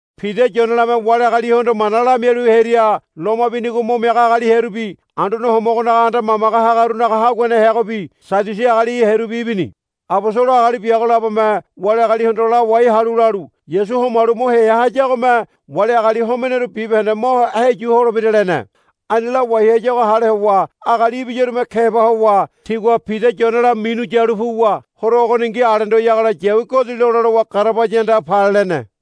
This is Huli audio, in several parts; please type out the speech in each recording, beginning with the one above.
Pida Yonelame wali agalihondo mana lamialu hearia loma binigo mo miaga agali hearubi Anduane Homogonaga anda mamage hagarunaga haguane heagobi Sadiusi agali hearubi ibini. Abosolo agali biago labome wali agalihondo lawai halu lalu, Yasu homalu mo heya hayagome wali agali homeneru bibahende mo heyu holebira, lene. Ani lawai hayago hale howa agali ibiyarume keba howa tigua Pida Yonela minu yalu puwa horo ogoningi alendoyagola yawi godi lole lowa garabaya andaha palelene.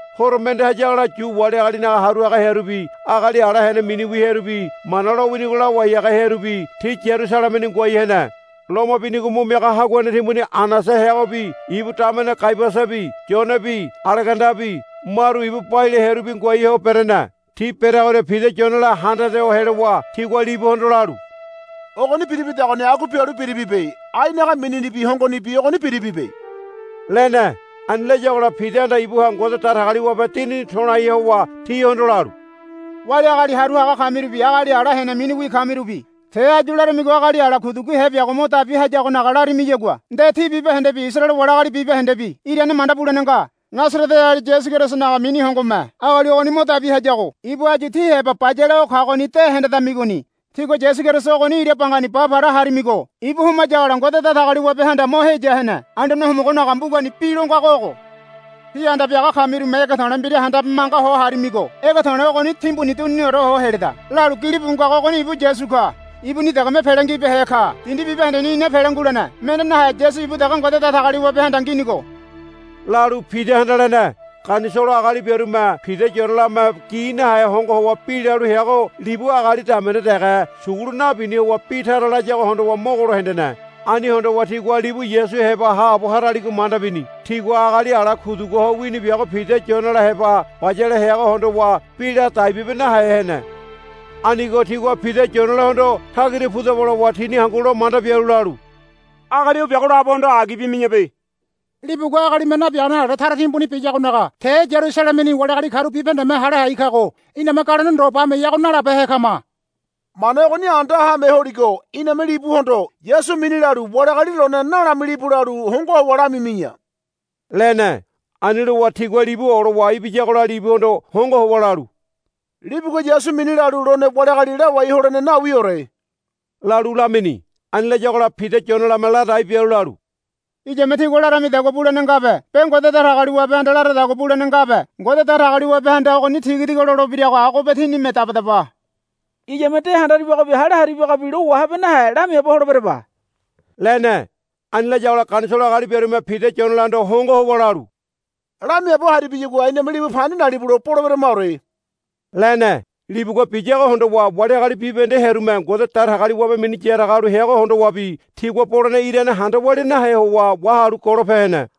Horo mende hayagola Yu wali agalinaga haru haga hearubi agali ala hene miniwi hearubi Mana lowinigo lawai haga hearubi ti Yarusalemeni ngoai hene. Loma binigo mo miaga haguane timbuni Anasa heagobi ibu damene Kaiabasabi Yonebi Alegandabi maru ibu baile hearubi ngoai ho berene. Ti bereagoria Pida Yonela handade ho helowa tigua libuhondo lalu, Ogoni biribidagoni agua bialu biribibe. Ainaga mininibi hongonibi ogoni biribibe, lene. Ani layagola Pidahanda ibuha Ngode Datagaliwabe Dinini to̱lai howa tihondo lalu, Wali agali haru haga kamirubi agali ala hene miniwi kamirubi te áyu laramigo agali ala kuduguhe biago mo dabi hayagonaga laramiyagua nde tí bibahendebi Isaraele wali agali bibahendebi irane manda bulene nga. Nasareteali Yasu Kerisonaga mini hongome agali ogoni mo dabi hayago ibu áyu tí heba bayale o kagoni de hendedamigoni. Tígua Yasu Keriso ogoni ira bangani ba para harimigo ibu homayagola Ngode Datagaliwabehanda mo heya hene. Anduane Homogonaga mbugani bi lo ngago ogo, Tí anda biaga kamirume ege to̱le̱ mbira handabe manga ho harimigo ege to̱le̱ ogoni timbuni duniniore ho heleda, lalu gilibu ngago ogoni ibu Yasu ka. Ibuni degeme pele ngibehe ka. Dindi bibahendeni ina pele ngulene mende nahe Yasu ibu dege Ngode Datagaliwabehanda nginigo, lalu Pidahanda lene. Ganisolo agali biarume Pida Yonelame gi nahe hongo howa bi lalu heago libu agali damene dege sigulu nabini howa bi tara layago hondowa mogolo hendene. Ani hondowa tigua libu Yasu heba haabo haraligo manda bini. Tigua agali ala kudugu ho wini biago Pida Yonela heba bayale heago hondowa bi ladai bibe nahe hene. Anigo tigua Pida Yonelahondo, Tagira pudaba, lowa tini hangu lo manda bialu lalu, Agali o biago labohondo agi bimi̱yabe. Libugua agalime nabiagane ale tara timbuni biyagonaga te Yarusalemeni wali agali karu bibahendeme hale hai kago. Iname galone ndo bameyago nalabehe kama. Mana ogoni anda haame holigo iname libuhondo, Yasu mini lalu wali agali lone nalamilibu, lalu hongo howa lamimi̱ya, lene. Ani lowa tigua libu olowa ibiyagola libuhondo hongo howa lalu, Libugua Yasu mini lalu lone wali agali lawai holene nawiore, lalu lamini. Ani layagola Pida Yonelame ladai bialu lalu, Iyame tígua laramidagua bulene ngabe be Ngode Datagaliwabehanda laradagua bulene ngabe. Ngode Datagaliwabehanda ogoni tigatiga lolebirago agobe tínime dabadaba. Iyame de handaribagobi hale haribagobi lo wahabe nahe lamiaabo holeberaba, lene. Ani layagola Ganisolo agali biarume Pida Yonelahondo hongo howa lalu, Lamiaabo haribiyagua iname libu pani nalibulo boleberamaore, lene. Libugua biyago hondowa wali agali bibahende hearume Ngode Datagaliwabe mini yaraga halu heago hondowabi tigua bolene irane handa walia nahe howa wahalu golope hene.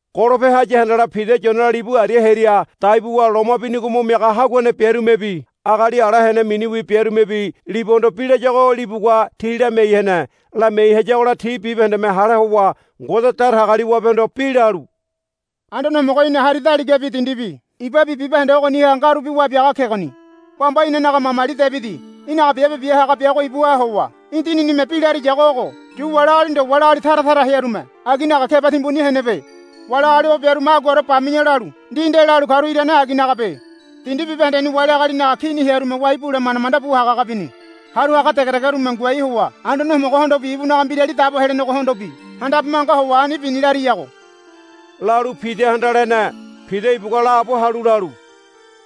Golope haya handala Pida Yonela libu aria hearia dai buwa loma binigo mo miaga haguane biarumebi agali ala hene miniwi biarumebi libuhondo bi layago libugua ti lamiai hene. Lamiai hayagola ti bibahendeme hale howa Ngode Datagaliwabehondo bi lalu, Anduane Homogo í̠na hari daligabi dindibi ibabi bibahende ogoniha ngarubi Wabiaga kegoni. Bamba inanaga mamali Debidi í̠naga biabe bia haga biago ibuha howa í̠ Dininime bi lariyago ogo, Yu wali agali ndo wali agali taratara hearume aginaga keba timbuni henebe. Wali agali o biarume aguaore bami̱ya lalu ndi nde lalu karu irane aginagabe. Dindi bibahendeni wali agalinaga kini hearume wai bule manda manda bu hagahaga bini. Haru haga dege degerume ngoai howa Anduane Homogohondobi ibunaga Mbirali Dabo Helenegohondobi handabe manga howa ani bini, lariyago, lalu Pidahanda lene. Pida ibugua laabo halu lalu,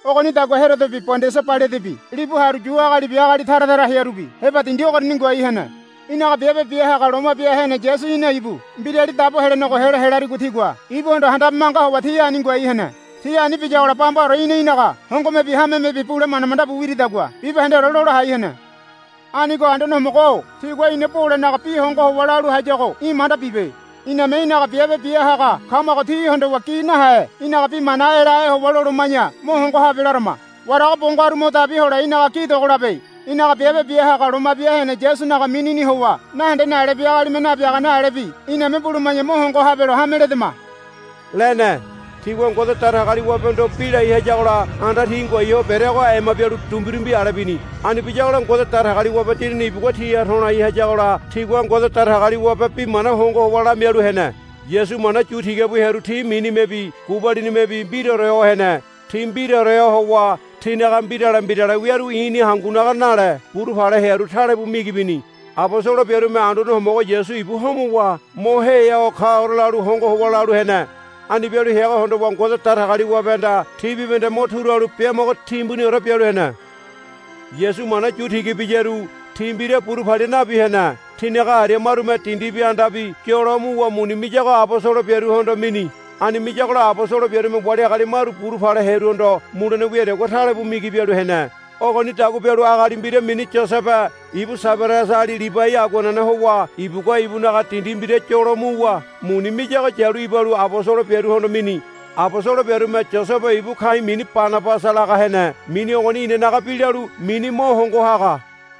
Ogonidagua Herodobi Pondiasa Pailatebi libu haru Yu agalibi agali tara tara hearubi heba dindi ogoriani ngoai hene. Í̠naga Biabe Bia Haga Loma Biahene Yasu í̠na ibu Mbirali Dabo Helenego helo helarigo tigua ibuhondo handabe manga howa ti ani ngoai hene. Ti ani biyagola bambaore í̠na í̠naga hongomebi hamemebi bule manda manda bu wiridagua bibahendeore lola hai hene. Anigo Anduane Homogo-o tigua ina bolenaga bi hongo howa lalu hayago í̠ manda bibe. Iname í̠naga biabe bia haga kamago ti hondowa gi nahe í̠naga bi mana elahe howa loloma̱ya mo hongo habe larama. Warago bo ngaru mo dabi hole í̠naga gi dogolabe. Í̠naga Biabe Bia Haga Loma Biahene Yasunaga minini howa nahendene alebi agalime nabiagane alebi iname buluma̱ya mo hongo habelo hame ledama, lene. Tigua Ngode Datagaliwabehondo bi lai hayagola anda ti ngoai ho bereago ema bialu dumbirumbi ale bini. Ani biyagola Ngode Datagaliwabe Dinini ibugua tiha to̱lai hayagola tigua Ngode Datagaliwabe bi mana hongo howa lamialu hene. Yasu mana yu tiga bu hearu ti minimebi gubalinimebi mbiraore ho hene. Ti mbiraore ho howa tinaga mbirale mbirale wiaru i̱ni hangunaga nale buru pale hearu talebu migi bini. Abosolo biarume Anduane Homogo Yasu ibu homowa mo heya ho kaore lalu hongo howa lalu hene. Ani bialu heago hondowa Ngode Datagaliwabehanda ti bibahende mo turu halu biamogo timbuniore bialu hene. Yasu mana yu tiga biyaru ti mbira buru palia nabi hene. Tinaga aria marume dindibi andabi yolo muwa muni miyago abosolo biaruhondo mini. Ani miyagola abosolo biarume wali agali maru buru pale hearuhondo mulene wiadagua talebu migi bialu hene. Ogonidagua bialu agali mbira mini Yosebe ibu Saibarasali Libai aguanene howa ibugua ibunaga dindi mbira yolo muwa muni miyago yalu ibalu abosolo biaruhondo mini. Abosolo biarume Yosebe ibu ka̱i̱ mini Banabasa laga hene. Mini ogoni inanaga bi lalu Mini mo hongo haga.